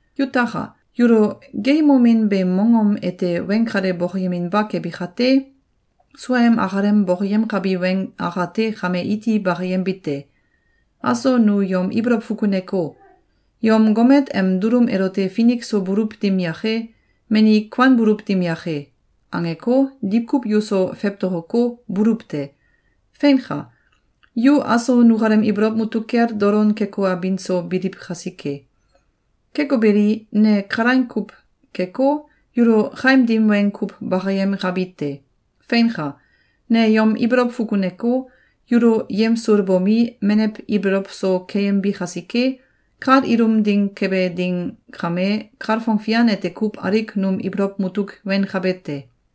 Yutaka! Yulo geeyemomin beem mongom ete weng kale bokoyeminba kebi kate, suaem akalem bokoyemkabi weng akate kame iti bakayembite: Aso nu yom ibolow fukuneko, “Yom gomet em dulum elote finik so buluw dim yake, mani kuanbuluw dim yake!”, angeko, diwkuw yuso fewtokoko, buluw te. Feinka! Yu aso nukalem ibolow mutuk kel dolon keko, abin so biliw kasike. Keko beli, ne kalaing kuw keko, yulo kaim dim weng kuw bakayemkabi te. Feinka! Ne yom ibolow fukuneko, yulo yemsulbomi, menew ibolow so keyembi kasike, kal ilum ding kebe ding kame, kalfong fian ete kuw alik num ibolow mutuk wenkabe te.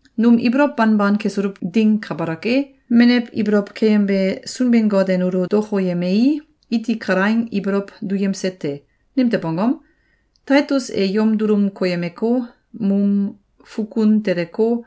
Num ibolow banban kesuluw ding kabalak e, menew ibolow keyembe Sunbin-Got e nulo dokoyemei, iti kalaing ibolow duyemse te. Nimtew angom? Taitus e yom dulum koyemeko, num fukun teleko,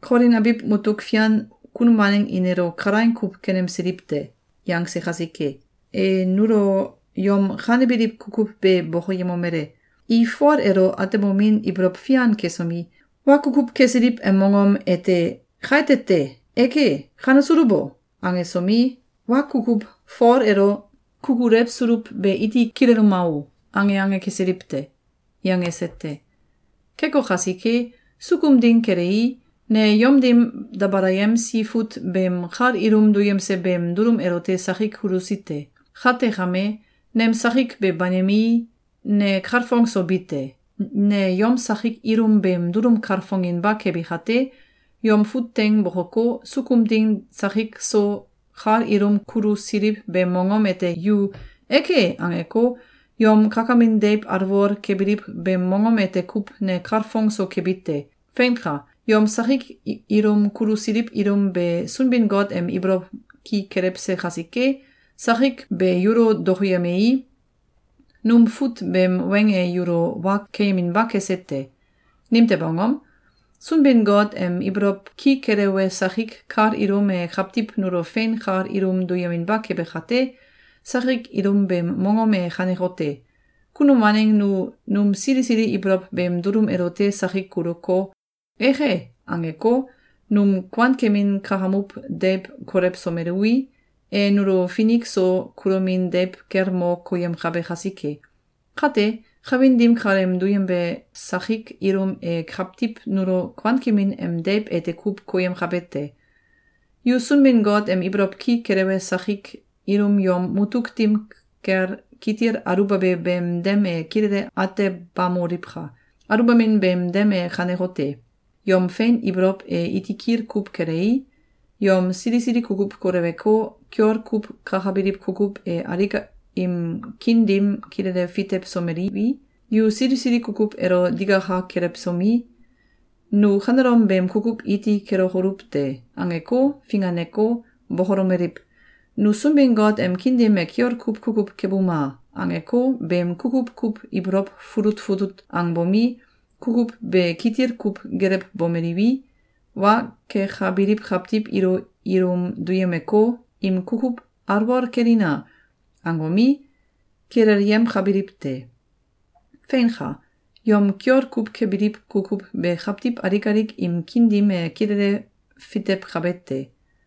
“Kolin abiw mutuk fian kunum waneng i nelo kalaing kuw kenemsiliw te!”, yangse kasike. E nulo yom kanebiliw kukuw be bokoyemomele: “I Fol elo atemomin ibolow fian kesomi, wa kukuw kesiliw em mongom ete ‘Kaite te! Eke! Kanesuluw o!’, angesomi, ‘Wa kukuw Fol elo kukulewsuluw be iti kileluma o!’, ange ange kesiliw te.”, yangese te. Keko kasike, sukum ding kelei, ne yom dim dabalayemsi fut beem kal ilum duyemse beem dulum elote sakik kulusi te. Kate kame, nem sakik be banimei, ne kalfong so bi te. Ne yom sakik ilum beem dulum kalfonginba kebi kate, yom fut teing bokoko, sukum ding sakik so kal ilum kulusililiw beem mongom ete yu “Eke!”, angeko, yom kakamin deiw alwol kebiliw beem mongom ete kuw ne kalfong so kebi te. Feinka! Yom sakik ilum kulusiliw ilum be Sunbin-Got em ibolow ki kelewse kasike, sakik be yulo dokoyemei, num fut beem weng e yulo wa keyeminba kese te. Nimtew angom? Sunbin-Got em ibolow ki kelewe sakik kal ilum e kawtiw nulo fein kal ilum duyeminba kebe kate, sakik ilum beem mongom e kanekote: Kunum waneng nu num sili sili ibolow beem dulum elote sakik kuluko, “Eke!”, angeko, num kuankemin kakamuw deiw kolewsomeluwi, e nulo finik so kulomin deiw kel mo koyemkabe kasike. Kate, kawin dim kaleem duyembe sakik ilum e kawtiw nulo kuankemin em deiw ete kuw koyemkabe te. Yu Sunbin-Got em ibolow ki kelewe sakik ilum yom mutuk dim kel kitil aluwbabe beem dem e kilele atebamoliwka! Aluwbamin beem dem e kanekote: Yom fein ibolow e iti kitil kuw kelei, yom sili sili kukuw koleweko, kiol kuw kakabiliw kukuw e alik im kiin dim kilele fitewsomeliwi, yu sili sili kukuw elo digaka kelewsomi, “Nu kanelom beem kukuw iti kelokoluw te!”, angeko, finganeko, bokolomeliw: “Nu Sunbin-Got em kiin dim e kiol kuw kukuw kebuma!”, angeko, beem kukuw kuw ibolow fulut fulut angbomi, kukuw be kitil kuw gelewbomeliwi, wa kekabiliw kawtiw ilo ilum duyemeko, im kukuw “Alwol kelina!”, angomi, kilelyemkabiliw te. Feinka! Yom kiol kuw kebiliw kukuw be kawtiw alik alik im kiin dim e kilele fitewkabe te.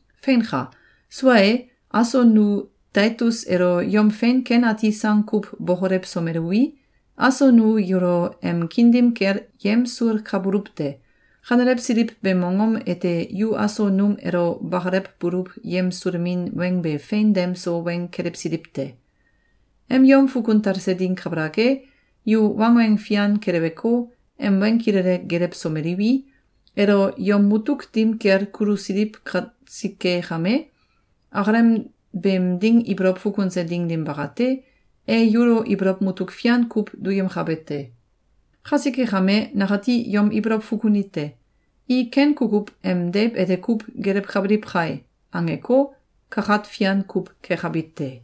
Feinka! Sua e, aso nu Taitus elo yom fein ken ati sang kuw bokolewsomeluwi, aso nu yulo em kiin dim kel yemsulkabuluw te. Kanelewsiliw beem mongom ete yu aso num elo bakalewbuluw yemsulemin weng be fein dem so weng kelewsiliw te. Em yom fukun talse ding kabalak e, yu wangweng fian keleweko, em weng kilele gelewsomeliwi, elo yom mutuk dim kel kulusiliw kasike kame, akalem beem ding ibolow fukunse ding dim bakate, e yulo ibolow mutuk fian kuw duyemkabe te. Kasike kame, nakati yom ibolow fukunite: “I ken kukuw em deiw ete kuw gelewkabiliw kai!”, angeko, kakat fian kuw kekabi te.